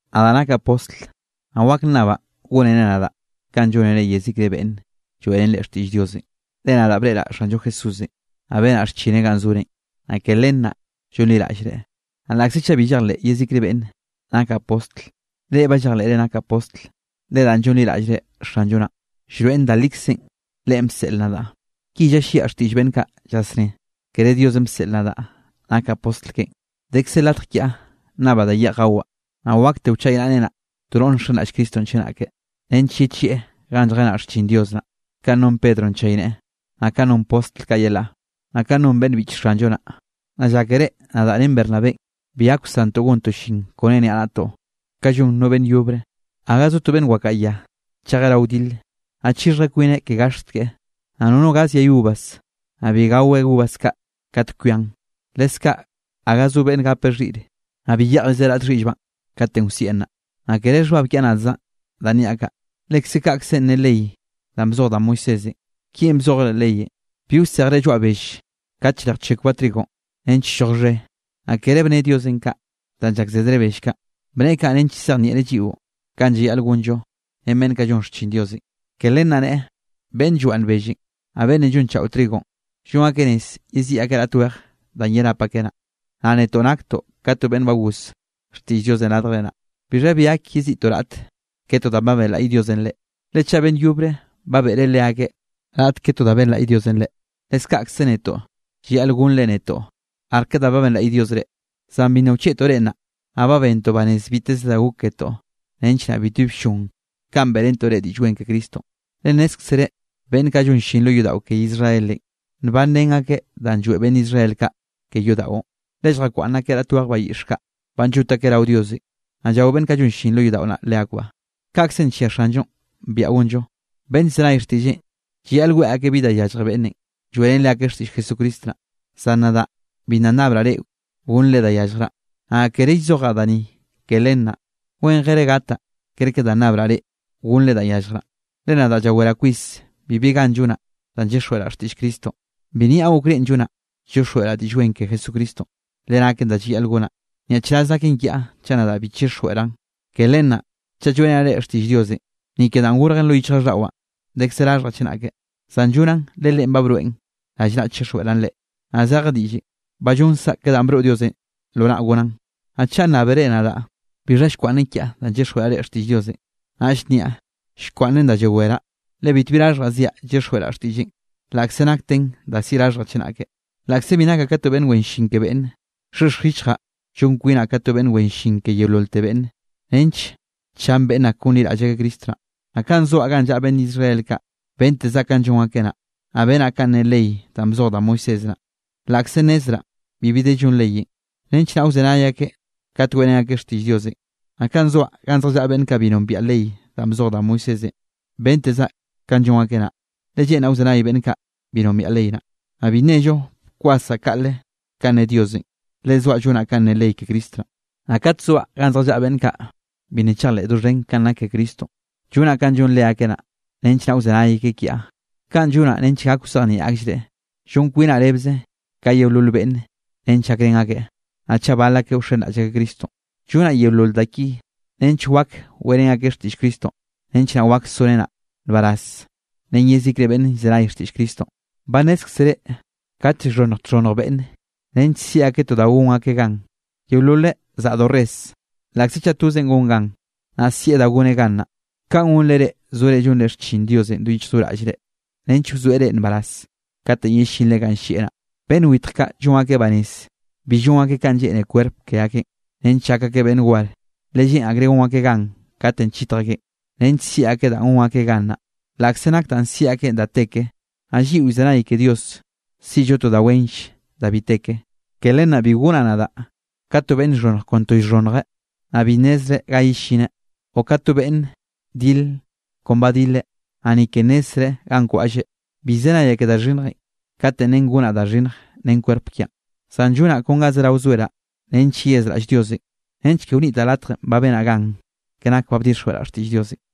Nadaꞌ nakaꞌ postl naꞌ wak nnabaꞌ gónere nadaꞌ kanꞌ llónere yezikre beꞌnn lloeꞌrén reꞌn xtiꞌll Diosenꞌ. Le nadaꞌ breꞌraꞌ Xanllo Jesúsenꞌ, naꞌ benaꞌ xchineꞌ ganꞌ zorenꞌ, naꞌ ke len naꞌ llonliraꞌllre. Naꞌ laꞌkze chaꞌ bi llejleꞌ yezikre beꞌnne nakaꞌ postl, reꞌ ba llejleꞌre nakaꞌ postl, le danꞌ llonliraꞌllre Xanllo naꞌ, llroeꞌn da likzenꞌ Leꞌen bseꞌl nadaꞌ. Ki llalliaꞌ xtiꞌll beꞌnn kaꞌ llasné, kere Diosenꞌ bseꞌl nadaꞌ nakaꞌ postl keꞌen: Dekze latj kiaꞌ nnabaꞌ da yeꞌj gawaꞌ. Naꞌ wakte wchaynaꞌrenaꞌ to noꞌre nxenraꞌll Cristonꞌ chenake, nench yechieꞌ ganꞌ lljenaꞌ xchin Dios naꞌ, kanꞌ non Pedronꞌ nchayneꞌe, naꞌ kanꞌ non postl kaꞌ yelaꞌ, naꞌ kanꞌ non beꞌnn biꞌch Xanllo naꞌ. ¿Naꞌ llákere nadaꞌ ren Bernabénꞌ bi gak wsantoꞌ gontoꞌ llin kone niaꞌnaꞌtoꞌ, ka llon no beꞌnn yobre? Gaga zo to beꞌnn wakaꞌa ya chejeꞌ rao wdile, naꞌ chixhjeꞌ kwineꞌ ke gaxt keꞌe. Naꞌ nono gaz yay uvas, naꞌ bi gaweꞌ uvas kaꞌ kat kwian. Leskaꞌ gaga zo beꞌnne gapeꞌ xhiꞌre, naꞌ bi yeꞌjrizeꞌ raꞌt xhiꞌllbaꞌ katenꞌ wsieꞌn naꞌ. Naꞌ kere xhbab kiaꞌ nadzaꞌn danꞌ niaꞌ kaꞌ, lekze kaꞌkzenꞌ ne ley danꞌ bzoj da Moisésenꞌ. Ki bzojeꞌ leꞌ leyenꞌ: “Bi wsejre lloaꞌ bell kate llrejchekwbaꞌ trigonꞌ nench lloj xhe.” Naꞌ kere bne Diosenꞌ kaꞌ danꞌ llakzedreꞌ bell kaꞌ. Bneꞌe kaꞌ nench llzejnieꞌreꞌ lliꞌo kanꞌ llayaꞌl gonllo ren beꞌnn kaꞌ llon xchin Diosenꞌ, ke len naꞌ neꞌe, beꞌnn llwaꞌnn bellenꞌ, naꞌ beꞌnn llonchaꞌo trigonꞌ, llon akeꞌ rez yeziꞌi akeꞌ raꞌt weje danꞌ yerap akeꞌ naꞌ. Naꞌ netoꞌ naktoꞌ ka to beꞌnn ba goz xtiꞌll Diosenꞌ radjre naꞌ. ¿Bixha bi gak yeziꞌtoꞌ raꞌt ke to danꞌ ba benlaꞌy Diosenꞌ reꞌ? Le chaꞌ beꞌnn yobre ba beꞌre leakeꞌ raꞌt ke to da benlaꞌy Diosenꞌ reꞌ, leskaꞌkze netoꞌ llayaꞌl gonnre netoꞌ arke da ba benlaꞌy Diosenꞌ reꞌ. Zan bi nna wchieꞌtoꞌ reꞌ naꞌ. Naꞌ ba bentoꞌ banez biteze da gok ketoꞌ nench naꞌ bitbi bllon kanꞌ beꞌrentoꞌ reꞌ Diꞌll Wen ke Cristonꞌ. Le nnézkzere beꞌnn kaꞌ llon llin lo yodaꞌo ke Israelenꞌ, nbanrén akeꞌ danꞌ lloeꞌ beꞌnn Israel kaꞌ ke yodaꞌon, le lljakwaꞌnn akeꞌ raꞌt weje bayiꞌx kaꞌ, banꞌ llot akeꞌ rao Diosenꞌ, naꞌ llao beꞌnn kaꞌ llon llin lo yodaꞌo naꞌ leakbaꞌ. Kaꞌkzenꞌ nllia Xanllonꞌ biaꞌa gonllo, beꞌnn llzenay xtiꞌlleꞌn llayaꞌl weꞌe akeꞌ bi da yallje beꞌnnenꞌ lloeꞌrén leakeꞌ xtiꞌll Jesucristo naꞌ. Zan nadaꞌ bi nna nnabraꞌ reꞌ gonnre da yalljraꞌ, naꞌ kere llzojaꞌ da ni ke len naꞌ. Wenjere gataꞌ ker ka da nnabraꞌ reꞌ gonnre danꞌ yalljraꞌ, le nadaꞌ llaweraꞌ kwis bibi gan llonaꞌ danꞌ llyixjweꞌraꞌ xtiꞌll Cristonꞌ. Bi nniaꞌ okrénꞌ llonaꞌ llyixjweꞌraꞌ Diꞌll Wen ke Jesucristonꞌ, le naken da llayaꞌl gonaꞌ. ¡Nyaꞌchraz naken kiaꞌ chaꞌ nadaꞌ bi chixjweꞌraꞌn! Ke len naꞌ chaꞌ lloeꞌrenaꞌ reꞌ xtiꞌll Diosenꞌ, ni ke danꞌ gorjen lo yichjraꞌlldaꞌwaꞌ, dekze raxhjaꞌ chenake; zan llonaꞌn le Leꞌen ba broeꞌn rallnaꞌ chixjweꞌraꞌn reꞌ, naꞌ zeje diꞌllenꞌ ba llonzaꞌ ke da ba broꞌ Diosenꞌ lo naꞌ gonaꞌn. Naꞌ chaꞌ nnábere nadaꞌ bixha llkwaꞌnnen kiaꞌ danꞌ llyixjweꞌraꞌ xtiꞌll Diosenꞌ, naꞌll nniaꞌ llkwaꞌnnen da llaweraꞌ, le bitbi raxhjaꞌ ziaꞌ llyixjweꞌraꞌ xtiꞌlleꞌn, laꞌkze nakten da siꞌi raxhjaꞌ chenake. Laꞌkze bi nakaꞌ ka to beꞌnn wen llin ke beꞌnne, llxhexj yichjaꞌ llon kwinaꞌ ka to beꞌnn wen llin ke yeololte beꞌnne nench chan beꞌnn ak gonliraꞌll akeꞌ Cristo naꞌ. Naꞌ kanꞌ zoaꞌ ganꞌ llaꞌa beꞌnn Israel kaꞌ, bentezaꞌ kanꞌ llon akeꞌ naꞌ. Naꞌ benaꞌ kanꞌ ne ley danꞌ bzoj da Moisés naꞌ (laꞌkze nnezraꞌ bibi de llon leyenꞌ) nench naꞌ wzenay akeꞌ kat weꞌrén akeꞌ xtiꞌll Diosenꞌ. Naꞌ kanꞌ zoaꞌ ganꞌ zjallaꞌa beꞌnn kaꞌ bi nombiaꞌ ley danꞌ bzoj da Moisésenꞌ, bentezaꞌ kanꞌ llon akeꞌ naꞌ, le lleꞌnraꞌ wzenay beꞌnn kaꞌ bi nombiaꞌ ley naꞌ. Naꞌ bi nnello bkwasaꞌ kaꞌle kanꞌ ne Diosenꞌ, le zoaꞌ llonaꞌ kanꞌ ne ley ke Cristo naꞌ. Naꞌ kat zoaꞌ ganꞌ zjallaꞌa beꞌnn kaꞌ bi nna chejleꞌ doxhen kanꞌ nak ke Cristonꞌ, llonaꞌ kanꞌ llon leakeꞌ naꞌ, nench naꞌ wzenay akeꞌ kiaꞌ. Kaꞌn llonaꞌ nench gak wzejnieꞌ akllreꞌ. Llon kwinaꞌ rebze ka yeolol beꞌnne nench gakrén akeꞌ, naꞌ chaꞌ bal akeꞌ wxenraꞌll akeꞌ Cristonꞌ. Llonaꞌ yeolol da ki nench wak weꞌrén akeꞌ xtiꞌll Cristonꞌ nench naꞌ wak sorenaꞌ nbaraz ren yezikre beꞌnne llzenay xtiꞌll Cristonꞌ. Ba nnézkzere kate llxhonnj txhonnj beꞌnne nench siꞌi akeꞌ to da gon akeꞌ gan, yeololeꞌ zaꞌdo res, laꞌkze chaꞌ tozeꞌn gon gan, naꞌ sieꞌ da goneꞌ gan naꞌ. Kaꞌn gonre reꞌ zore llonre xchin Diosenꞌ do yichj do raꞌllre, nench wzoeꞌ reꞌ nbaraz kat yellinre ganꞌ llieꞌ naꞌ. Beꞌnn witj kaꞌ llon akeꞌ banez bi llon akeꞌ ka lleꞌne kwerp ke akeꞌn, nench llak akeꞌ beꞌnn war, le lleꞌn akreꞌ gon akeꞌ gan katenꞌ chitj akeꞌn, nench siꞌi akeꞌ danꞌ gon akeꞌ gan naꞌ, laꞌkze nak danꞌ siꞌi akeꞌn da te ke. Naꞌ lliꞌo llzenay ke Diosenꞌ siꞌllo to da wenll da bi te ke. Ke len naꞌ bi gonaꞌ nadaꞌ ka to beꞌnn llxhonnje kon to llxhonnjeꞌ, naꞌ bi nnezreꞌ ga yellineꞌ, o ka to beꞌnne dil kon ba dileꞌ, naꞌ ni ke nnezzreꞌ ganꞌ kwaꞌlleꞌ. Bi llzenayaꞌ ke da xhinnjenꞌ kate nen gonaꞌ da xhinnj ren kwerp kiaꞌn. Zan llonaꞌ kon ga zerao zoeraꞌ nench yeyazraꞌll Diosenꞌ, nench ke wnitaꞌ latjenꞌ ba benaꞌ gan ke nak ba bdixjweꞌraꞌ xtiꞌll Diosenꞌ.